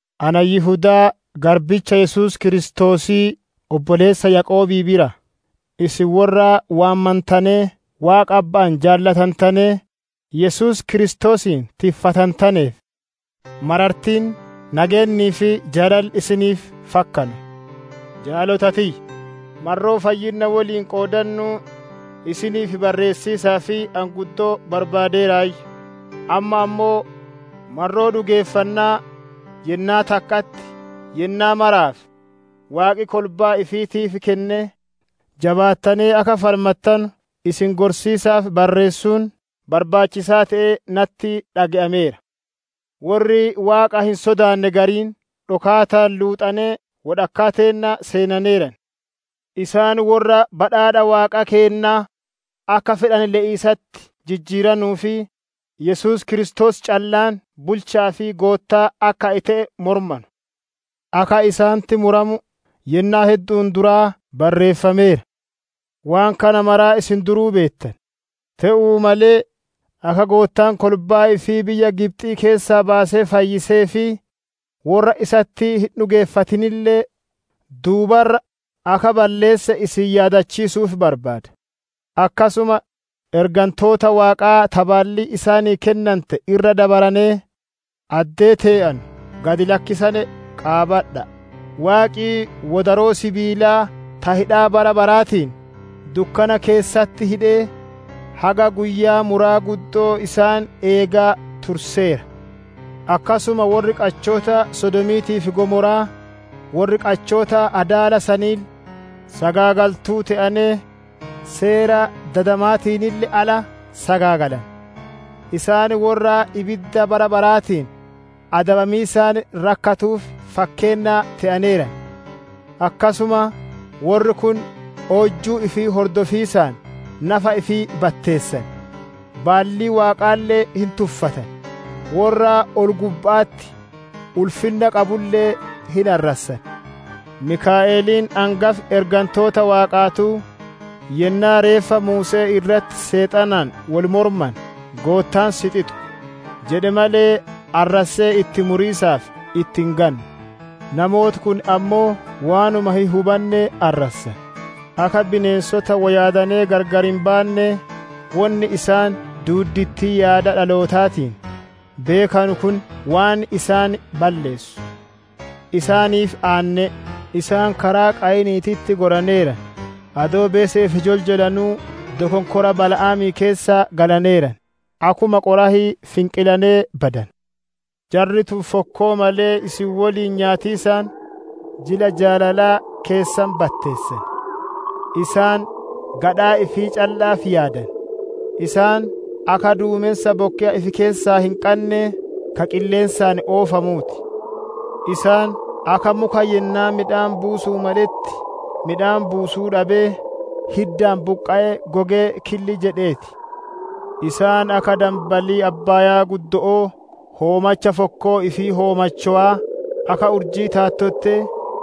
Ana Yihudaa garbicha Yesuus Kiristoosii, obboleessa Yaaqoobii biraa: Isin worra waamantanee, Waaqa Abba'aan jaalatantanee, Yesuus Kiristoosiin tiffantaneef: Marartiin, nageennii fi jaalalli isiniif fakkanu. Jaalota tiyya! Marroo fayyinna woliin qoodannuu isiniif barreessiisaaf ani guddoo barbaadeeraayyu; amma ammoo marroo dhugeeffannaa yennaa takka'atti yennaa maraaf Waaqi kolbaa ifiitiif kennee, jabaattanee akka falmattanu isin gorsiisaaf barreessuun, barbaachisaa te'ee natti dhage'ameera. Worri Waaqa hin sodaanne gariin, dhokaataan luuxanee wodhakkaa teenna seenaneeran. Isaan worra badhaadha Waaqa keennaa akka fedhane le'iisatti jijjiiranuu fi Yesuus Kiristoos callaan bulcha'aa fi Goottaa akka te'e mormanu. Akka isaanitti muramu yennaa heddu'uun duraa barreeffameera. Waan kana maraa isin duruu beettan, te'uu malee, akka Goottaan kolbaa ifii biyya Gibxii keessaa baasee fayyisee fi worra isatti hin dhugeeffatinille duuba irra akka balleesse isin yaadachiisu'uuf barbaada. Akkasuma ergantoota Waaqaa ta baallii isaanii kennante irra dabaranee, addee tee'anu gad lakkisane qaabadha'a! Waaqi wodaroo sibiilaa ta hidhaa bara baraatiin dukkana keessatti hidhee, haga guyyaa muraa guddo'oo isaan eegaa turseera. Akkasuma worri qachoota Sodoomiitii fi Gomora'aa, worri qachoota adaala saniille sagaagaltuu te'anee, seera dadamaatiinille ala sagaagalane. Isaan worra ibidda bara baraatiin adabamiisaan rakkatuuf fakkeenna te'aneeran. Akkasuma, worri kun oojjuu ifii hordofiisaan nafa ifii batteessan; baallii Waaqaalle hin tuffatan, worra ol-gubba'atti ulfinna qabulle hin arrassan. Mikaa'eliin angafi ergantoota Waaqaatuu, yennaa reeffa Muuse'ee irratti Seexanaan wol mormane, «Goottaan si xixu» jedhe malee, arrassee itti muriisaaf itti hin gamne. Namooti kun ammoo waanuma hin hubanne arrassan; akka bineensota wo yaadanee gargar hin baannee, wonni isaan duuddittii yaada dhalootaatiin beekanu kun waan isaan balleessu. Isaaniif aanne'e! Isaan karaa Qaayiniititti goraneeran; adoo beese'eef joljolanuu dokonkora Bala'aamii keessa galaneeran; akkuma Qoraahii finqilanee badane. Jarri tun fokkoo malee isin woliin nyaatiisaan jila jaalalaa keessan batteessan. Isaan gadhaa ifii calla'aaf yaadan; isaan akka duumensa bokkeya ifi keessaa hin qannee, ka qilleensaan oofamuu ti. Isaan akka muka yennaa midhaan buusu'uuf maletti midhaan buusuu dhabee, hiddaan buqqa'ee gogee killi jedhee ti. Isaan akka danbalii abbaaya'aa, hoomacha fokkoo ifii hoomachowaa, akka urjii taattottee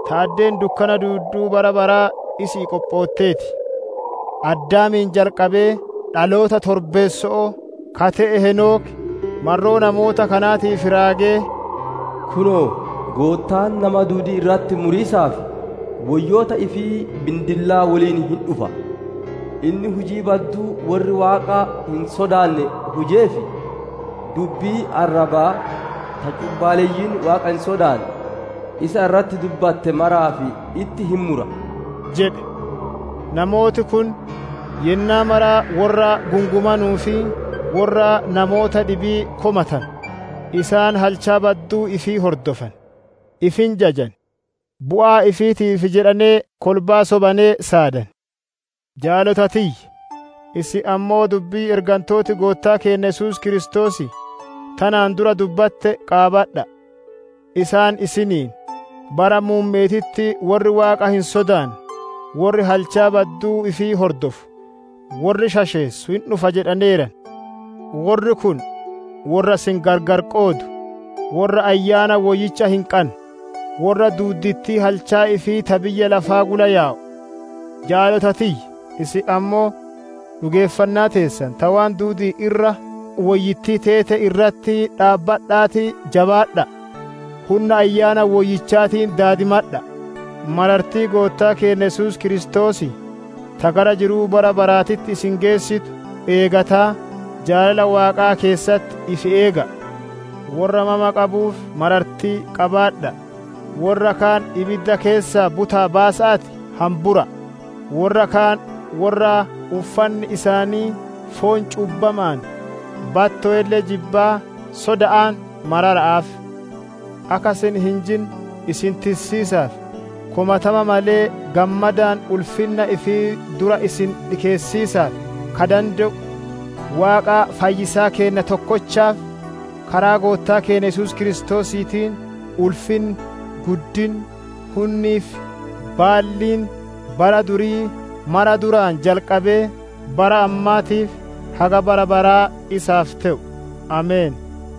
ta addeen dukkana duudduu bara baraa isi'ii qophoottee ti. Addaamii jalqabee dhaloota torbeesso'oo ka te'e Heenoki, marroo namoota kanaatiif raagee, «Kunoo, Goottaan nama duudii irratti muriisaaf woyyoota ifii bindillaa woliin hin dhufa. Inni hujii badduu worri Waaqa hin sodaanne hujee fi dubbii arrabaa ta cubbaaleyyiin Waaqa hin sodaanne isa irratti dubbatte maraaf itti hin mura» jedhe. Namooti kun yennaa mara worra gungumanuu fi worra namoota dhibii komatanu; isaan halchaa badduu ifii hordofan, ifi hin jajan, bu'aa ifiitiif jedhanee kolbaa sobanee saadan. Jaalota tiyya, isin ammoo dubbii ergantooti Goottaa keenna Yesuus Kiristoosii tanaan dura dubbatte qaabadha'a! Isaan isiniin, «Bara muumme'eetitti worri Waaqa hin sodaanne worri halchaa badduu ifii hordofu, worri shasheessu hin dhufa» jedhaneeran. Worri kun worra isin gargar qoodu, worra Ayyaana Woyyicha hin qanne, worra duuddittii halchaa ifii ta biyya lafaa gula yaa'u. Jaalota tiyya, isin ammoo dhugeeffannaa teessan ta waan duudi'iin irra woyyittii teete irratti dhaabbadha'aatii jabaadha'a! Hunna Ayyaana Woyyichaatiin daadimadha'a! Marartiin Goottaa keenna Yesuus Kiristoosii, ta gara jiruu bara baraatitti isin geessitu eeggataa, jaalala Waaqaa keessatti ifi eega'a! Worra mama qabuuf marartii qabaadha'a! Worra kaan ibidda keessaa buta'aa baasa'aatii hambura'a! Worra kaan worra uffanni isaanii foon cubbama'aan battowelle jibbaa, soda'aan marara'aaf! Akka isin hin jinne isin tissiisaa fi komatama malee, gammadaan ulfinna ifii dura isin dhikeessiisaaf ka dande'u, Waaqa fayyisaa keenna tokkochaaf, karaa Goottaa keenna Yesuus Kiristoosiitiin, ulfinni, guddinni, hunnii fi baalliin bara durii mara duraan jalqabee, bara ammaatii fi haga bara baraa isaaf te'u! Ameen.